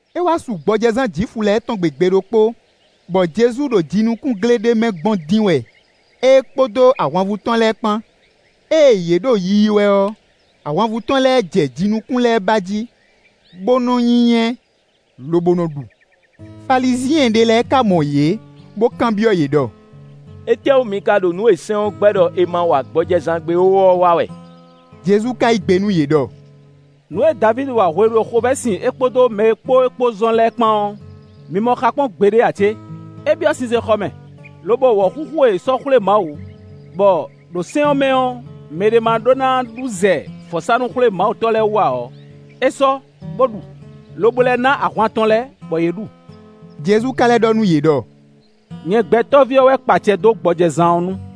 É wá su gbɔjɛzán Jwifu lɛ́ɛ tɔn gbe gbe ɖokpó, bɔ Jezu ɖo jinukúngle ɖé mɛ gbɔn dín wɛ é kpódó ahwanvú tɔn lɛ́ɛ kpán. Ée yě ɖo yiyi wɛ ɔ́, ahwanvú tɔn lɛ́ɛ jɛ jinukún lɛ́ɛ ba jí, bó nɔ́ nyínyɛ́, lobo nɔ ɖu. Falizyɛn ɖé lɛ́ɛ ka mɔ yě, bó kanbyɔ́ yě ɖɔ: “Étɛ́wú mi ka ɖo nǔ e sɛ́n ɔ́ gbɛ́ ɖɔ è ma wa gbɔjɛzán gbe ó ɔ́ wa wɛ?” Jezu ka yí gbe nú yě ɖɔ: “Nǔ e Davídi wa hwenu e xovɛ́ sin é kpódó mɛ e kpó é kpó zɔn lɛ́ɛ kpán ɔ́, mi mɔ xa kpɔ́n gbeɖé ǎ cé? É byɔ́ sinsɛnxɔ mɛ, lobɔ wɔ̌xúxú e è sɔ́ xwlé Mawu, bɔ ɖo sɛ́n ɔ́ mɛ ɔ́ mɛɖé ma ɖó ná ɖu zɛ vɔ̌sánú-xwlémawutɔ́ lɛ́ɛ wú ǎ ɔ́, é sɔ́, bó ɖu, lobo lɛ́ ná ahwan tɔn lɛ́ɛ, bɔ yě ɖu.” Jezu ka lɛ́ ɖɔ nú yě ɖɔ: “Nyɛ Gbɛtɔ́ví ɔ́ wɛ kpa acɛ dó gbɔjɛzán ɔ́ nu.”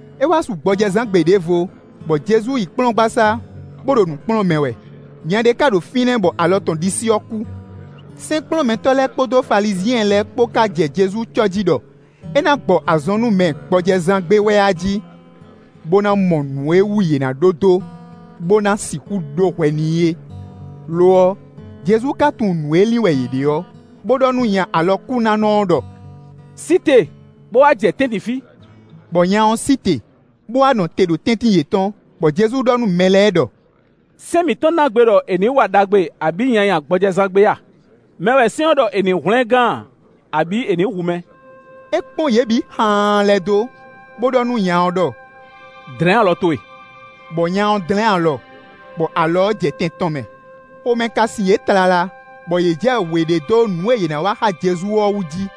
É wá su gbɔjɛzán gbe ɖěvo, bɔ Jezu yi kplɔ́ngbasá, bó ɖo nǔ kplɔ́n mɛ wɛ. Nya ɖé ká ɖo fínɛ́, bɔ alɔ tɔn ɖisí ɔ́ kú. Sɛ́nkplɔ́nmɛtɔ́ lɛ́ɛ kpódó Falizyɛn lɛ́ɛ kpó ká jɛ Jezu cɔ́ jí ɖɔ é ná gbɔ azɔn nú mɛ gbɔjɛzán gbe wɛ a jí, bó ná mɔ nǔ e wú yě ná ɖó dó, bó ná sixú ɖó hwɛ n'i é. Lo ɔ́, Jezu ka tunwun nǔ e lin wɛ yě ɖe ɔ́, bó ɖɔ nú nya alɔkúnánɔ ɔ́ ɖɔ: “Sí te, bó wá jɛ tɛ́ntin fí.” Bɔ nya ɔ́ sí te, bó wá nɔ te ɖo tɛ́ntin yětɔn. Bɔ Jezu ɖɔ nú mɛ lɛ́ɛ ɖɔ: “Sɛ́n mǐtɔn ná gbe ɖɔ è nǐ wa ɖagbe abǐ nyanya gbɔjɛzán gbe a? Mɛ wɛ sɛ́n ɔ́ ɖɔ è nǐ hwlɛ́n gán a, abǐ è nǐ hu mɛ?” É kpɔ́n yě bǐ xaan lɛ́ dó, bó ɖɔ nú nya ɔ́ ɖɔ: “Dlɛ̌n alɔ towe.” Bɔ nya ɔ́ dlɛ́n alɔ, bɔ alɔ ɔ́ jɛ tɛn tɔn mɛ. Xomɛ ka sin yě tlala, bɔ yě jɛ wě ɖe dó nǔ e yě ná wa xá Jezu ɔ́ wú jí.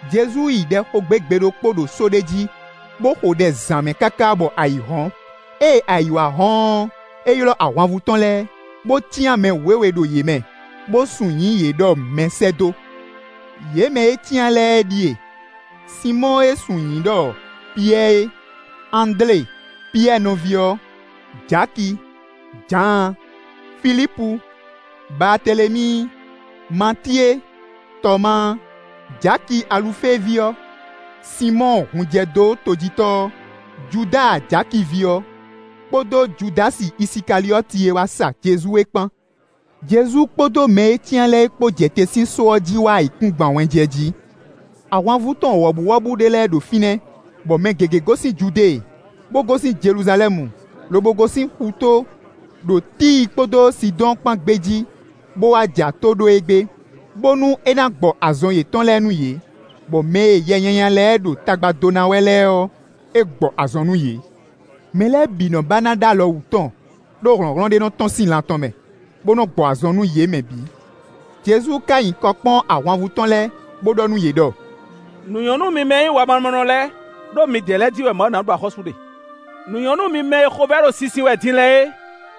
Jezu yi ɖɛ xo gbé gbe ɖokpó ɖo só ɖé jí, bó xo ɖɛ zǎn mɛ káká bɔ ayǐ hɔ́n. Ée ayǐ wá hɔ́n ɔ́, é ylɔ́ ahwanvú tɔn lɛ́ɛ, bó cyán mɛ wěwe ɖo yě mɛ, bó sun nyǐ yě ɖɔ mɛsɛ́dó: Yě mɛ e é cyán lɛ́ɛ ɖíe: Sinmɔ́ɔ e è sun nyǐ ɖɔ Piyɛ́ɛ é, Andlé Piyɛ́ɛ nɔví ɔ́, Jaki, Jǎan, Filípu, Baatelemíi, Matíe, Tɔmáa, Jaki Alufée ví ɔ́, Sinmɔ́ɔ hunjɛdótojítɔ́ ɔ́, Judáa Jaki ví ɔ́, kpódó Judási Isikaliɔ́ti e wá sa Jezu é kpán. Jezu kpódó mɛ e é cyán lɛ́ɛ kpó jɛ te sín só ɔ́ jí wá ayǐkúngban wɛnjɛ jí. Ahwanvú tɔn wɔ̌buwɔ́bú ɖé lɛ́ɛ ɖo fínɛ́, bɔ mɛ gěgé gosín Judée, bó gosín Jeluzalɛ́mu, lobo gosín xutó, ɖo Tíi kpódó Sidɔ́ɔn kpán gbé jí, bó wá ja tó ɖó e gbé, bónú é ná gbɔ azɔn yětɔn lɛ́ɛ nú yě, bɔ mɛ e yɛ nyanya lɛ́ɛ ɖo tagba dó ná wɛ lɛ́ɛ ɔ́, é gbɔ azɔn nú yě. Mɛ lɛ́ɛ bǐ nɔ́ ba ná ɖó alɔ wǔ tɔn, ɖó hlɔ̌nhlɔ́n ɖé nɔ tɔ́n sín lan tɔn mɛ, bó nɔ́ gbɔ azɔn nú yě mɛ bǐ. Jezu ka nyi kɔ kpɔ́n ahwanvú tɔn lɛ́ɛ, bó ɖɔ nú yě ɖɔ: “Nǔ nyɔ́ nú mi mɛ e nyí wamamɔnɔ lɛ́ɛ, ɖó midɛɛ lɛ́ɛ jí wɛ Mawu ná ɖu axɔ́sú ɖe. Nǔ nyɔ́ nú mi mɛ e xovɛ́ ɖo sinsin wɛ din lɛ́ɛ é,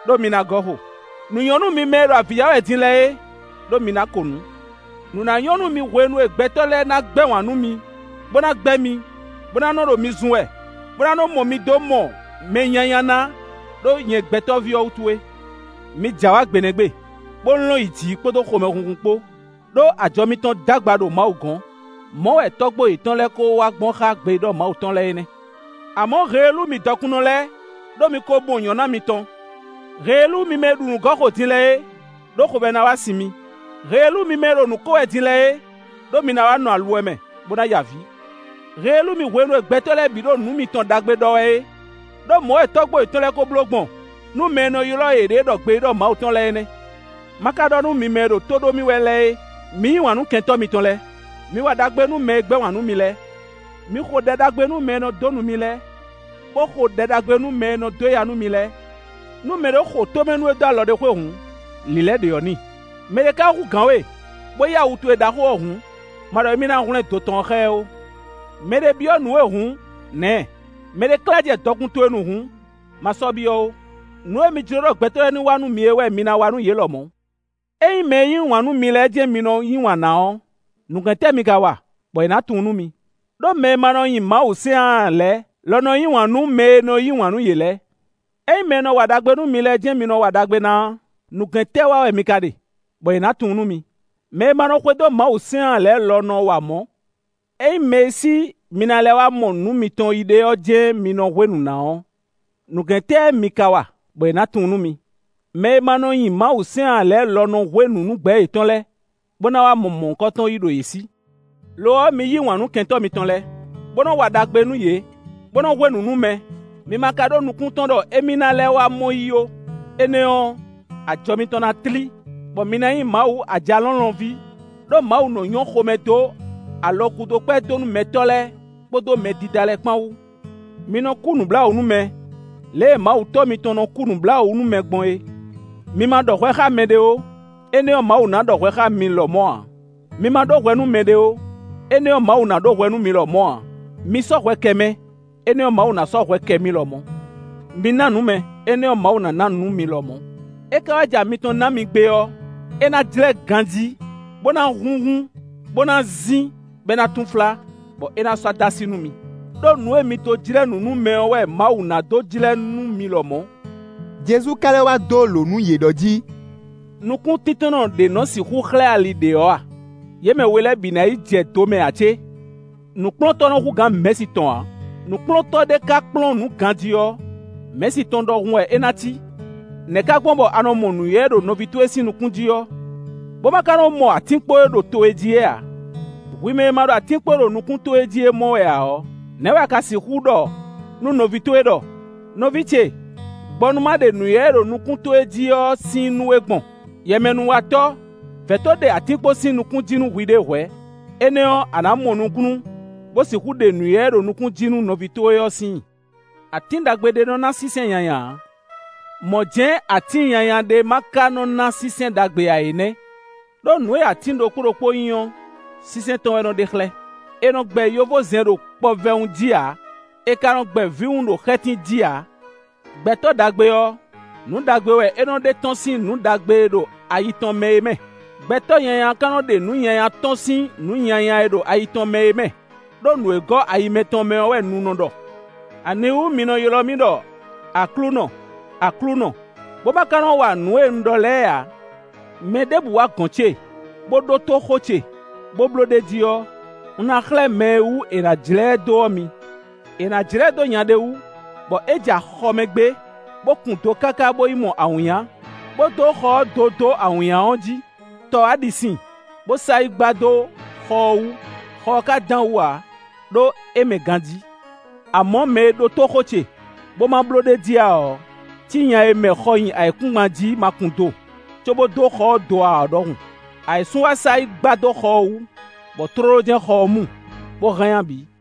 ɖó mi ná gɔ́ xo. Nǔ nyɔ́ nú mi mɛ e ɖo avǐ ya wɛ din lɛ́ɛ é, ɖó mi ná ko nǔ. “Nǔ ná nyɔ́ nú mi hwenu e gbɛtɔ́ lɛ́ɛ ná gbɛ́ wǎn nú mi, bó ná gbɛ́ mi, bó ná nɔ́ ɖo mi zun wɛ, bó ná nɔ́ mɔ mi dó mɔ mɛ nyanya ná ɖó nyɛ Gbɛtɔ́ví ɔ́ wútu é. Mi j'awǎ gbe nɛ́ gbe, bó lɔ́n yi jǐ kpódó xomɛhunhun kpó, ɖó ajɔ mitɔn d'agba ɖo Mawu gɔ́n. Mɔ̌ wɛ tɔ́gbó yětɔn lɛ́ɛ kó wa gbɔn xá gbeyíɖɔ Mawu tɔn lɛ́ɛ é nɛ́. Amɔ̌, heelú mi dɔkunnɔ lɛ́ɛ, ɖó mi ko mɔ nyɔ̌ná mitɔn! Heelú mi mɛ e ɖu nǔ gɔ́ xo din lɛ́ɛ é, ɖó xovɛ́ ná wá sin mi! Heelú mi mɛ e ɖo nǔ ko wɛ din lɛ́ɛ é, ɖó mi ná wá nɔ aluwɛ mɛ, bó ná ya avǐ! Heelú mi hwenu e gbɛtɔ́ lɛ́ɛ bǐ ɖo nǔ mitɔn ɖagbe ɖɔ wɛ é, ɖó mɔ̌ wɛ tɔ́gbó yětɔn lɛ́ɛ ko bló gbɔn nú mɛ e nɔ ylɔ́ yěɖée ɖɔ gbeyíɖɔ Mawu tɔn lɛ́ɛ é nɛ́!” “Má ka ɖɔ nú mi mɛ e ɖo tó ɖó mì wɛ lɛ́ɛ é: Mi yí wǎn nú kɛntɔ́ mitɔn lɛ́ɛ; mi wa ɖagbe nú mɛ e gbɛ́ wǎn nú mi lɛ́ɛ. Mi xo ɖɛ ɖagbe nú mɛ e nɔ dó nu mi lɛ́ɛ, bó xo ɖɛ ɖagbe nú mɛ e nɔ dó ya nú mi lɛ́ɛ. Nú mɛɖé xo tómɛ nú we dó alɔ ɖé xwé hǔn, lǐlɛ́ ɖě ɔ́ n'i; mɛɖé ka hú gǎn we bó yí awu towe ɖaxó ɔ́ hǔn, ma ɖɔ émí ná hwlɛ́n do tɔn ɔ́ xá ɛ ó. Mɛ ɖé byɔ́ nǔ we hǔn, nǎ ɛ; mɛɖé klá jɛ dɔkun towe nu hǔn, ma sɔ́ kanbyɔ́ ó. Nǔ e mi jló ɖɔ gbɛtɔ́ lɛ́ɛ ní wa nú mi é wɛ mi ná wa nú yě lɔmɔ̌. “Ényí mɛ e yí wǎn nú mi lɛ́ɛ jɛ́n mi nɔ yí wǎn ná ɔ́, nǔgɛ́n tɛ́ mi ka wa, bɔ è nǎ tunwun nú mi? Đó mɛ e ma nɔ nyi Mawusɛ́n ǎ lɛ́ɛ lɔ nɔ yí wǎn nú mɛ e nɔ yí wǎn nú yě lɛ́ɛ. Ényí mɛ e nɔ wa ɖagbe nú mi lɛ́ɛ jɛ́n mi nɔ wa ɖagbe ná ɔ́, nǔgɛ́n tɛ́ wa wɛ mi ka ɖe, bɔ è nǎ tunwun nú mi? Mɛ e ma nɔ xwedó Mawusɛ́n ǎ lɛ́ɛ lɔ nɔ wa mɔ̌. Ényí mɛ e sí mi ná lɛ́ wá mɔ nǔ mitɔn yí ɖe ɔ́ jɛ́n mi nɔ hwé nǔ ná ɔ́, nǔgɛ́n tɛ́ mi ka wa, bɔ è nǎ tunwun nú mi? Mɛ e ma nɔ nyi Mawusɛ́n ǎ lɛ́ɛ lɔ nɔ hwé nǔ nú gbɛ̌ yětɔn lɛ́ɛ, bó ná wá mɔ mɔ̌hunkɔtɔn yí ɖo yě sí. Lo ɔ́, mi yí wǎn nú kɛntɔ́ mitɔn lɛ́ɛ, bó nɔ́ wa ɖagbe nú yě, bó nɔ́ hwé nǔ nú mɛ, mi ma ka ɖó nukún tɔn ɖɔ émí ná lɛ́ wá mɔ yí ó, énɛ́ ɔ́, ajɔ mitɔn ná tlí, bɔ mi ná nyí Mawu Ajalɔ̌nlɔn ví; ɖó Mawu nɔ́ nyɔ́ xomɛ dó alɔgúdokpɛ́dónúmɛtɔ́ lɛ́ɛ kpódó mɛdídá lɛ́ɛ kpán wú. Mi nɔ kú nǔbláwǔ nú mɛ, lě e Mawu Tɔ́ mitɔn nɔ kú nǔbláwǔ nú mɛ gbɔn é.” “Mi ma ɖɔ hwɛ xá mɛɖé ó, énɛ́ ɔ́, Mawu ná ɖɔ hwɛ xá mi lɔmɔ̌ ǎ; mi ma ɖó hwɛ nú mɛɖé ó, énɛ́ ɔ́, Mawu ná ɖó hwɛ nú mi lɔmɔ̌ ǎ. Mi sɔ́ hwɛ kɛ mɛ, énɛ́ ɔ́, Mawu ná sɔ́ hwɛ kɛ mi lɔmɔ̌. Mi ná nǔ mɛ, énɛ́ ɔ́, Mawu ná ná nǔ mi lɔmɔ̌. É ka wá ja mitɔn ɔ́ ná mi gbé ɔ́, é ná jlɛ́ ganjí, bó ná húnhún, bó ná zín, bɔ é ná túnflá, bɔ é ná sɔ́ dó así nú mi; ɖó nǔ e mi dó jlɛ́ nǔ nú mɛ ɔ́ wɛ Mawu ná dó jlɛ́ nú mi lɔmɔ̌.” Jezu ka lɛ́ wá dó lǒ nú yě ɖɔ jí: “Nukúntíntɔ́nnɔ ɖě nɔ sixú xlɛ́ ali ɖě ɔ́ a? Yě mɛ we lɛ́ɛ ná yi jɛ do mɛ ǎ cé? Nǔkplɔ́ntɔ́ nɔ́ hú gǎn mɛ̌si tɔn ǎ; nǔkplɔ́ntɔ́ ɖé ká kplɔ́n nǔ ganjí ɔ́, mɛ̌si tɔn ɖɔhun wɛ é ná cí.” “Nɛ̌ ká gbɔn bɔ a nɔ mɔ nǔywɛ́ e ɖo nɔví towe sín nukún jí ɔ́, bó ma ka nɔ mɔ atínkpo e ɖo towe jí é ǎ? Hwi mɛ e ma ɖo atínkpo e ɖo nukún towe jí é mɔ wɛ ǎ ɔ́, nɛ̌ wɛ a ka sixú ɖɔ nú nɔví towe ɖɔ: ‘Nɔví ce, gbɔ nú ma ɖe nǔywɛ́ e ɖo nukún towe jí ɔ́ sín i nú we’ gbɔn? Yɛmɛnúwatɔ́, vɛ̌ to ɖe atínkpo sín nukún jí nú hwiɖée hwɛ̌; énɛ́ ɔ́, a nǎ mɔ nukúnnú, bó sixú ɖe nǔywɛ́ e ɖo nukún jí nú nɔví towe ɔ́ sín i.” “Atín ɖagbe ɖé nɔ ná sínsɛ́n nyanya ǎ, mɔ̌ jɛ́n atín nyanya ɖé má ka nɔ́ ná sínsɛ́n ɖagbe ǎ é nɛ́. Đó nǔ e atín ɖokpó ɖokpó nyí ɔ́, sínsɛ́n tɔn wɛ nɔ ɖe xlɛ́. È nɔ gbɛ yovózɛn ɖo kpɔvɛwun jí ǎ; è ka nɔ gbɛ vǐwun ɖo xɛ́tín jí ǎ. Gbɛtɔ́ ɖagbe ɔ́, nǔ ɖagbe wɛ é nɔ ɖe tɔ́n sín nǔ ɖagbe e ɖo ayi tɔn mɛ é mɛ. Gbɛtɔ́ nyanya ka nɔ ɖe nǔ nyanya tɔ́n sín nǔ nyanya e ɖo ayi tɔn mɛ é mɛ; ɖó nǔ e gɔ́ ayi mɛtɔn mɛ ɔ́ wɛ nu nɔ ɖɔ.” “Aniwú mi nɔ ylɔ́ mì ɖɔ ‘Aklúnɔ, Aklúnɔ’, bó má ká nɔ́ wa nǔ e un ɖɔ lɛ́ɛ ǎ? Mɛɖěbǔ wá gɔ̌n ce, bó ɖótó xó ce, bó bló ɖ'é jí ɔ́, un ná xlɛ́ mɛ e wú è nǎ jlɛ́ ɛ dó ɔ́ mi. È nǎ jlɛ́ ɛ dó nya ɖé wú, bɔ é ja xɔ mɛ gbé, bó kun do káká bó yi mɔ awǐnnya, bó dó xɔ ɔ́ do dó awǐnnya ɔ́ jí. Tɔ wá ɖi sin, bó sa yi gba dó xɔ ɔ́ wú, xɔ ɔ́ ka dán wǔ ǎ, ɖó é mɛ ganjí. Amɔ̌, mɛ e ɖótó xó ce, bó ma bló ɖ'é jí ǎ ɔ́ cí nya e mɛ xɔ nyi ayǐkúngban jí ma kun do, cóbó dó xɔ ɔ́ do ǎ ɔ́ ɖɔhun; ayǐsun wá sa yi gba dó xɔ ɔ́ wú, bɔ tlóló jɛ́n xɔ ɔ́ mu, bó hánnyá bǐ.”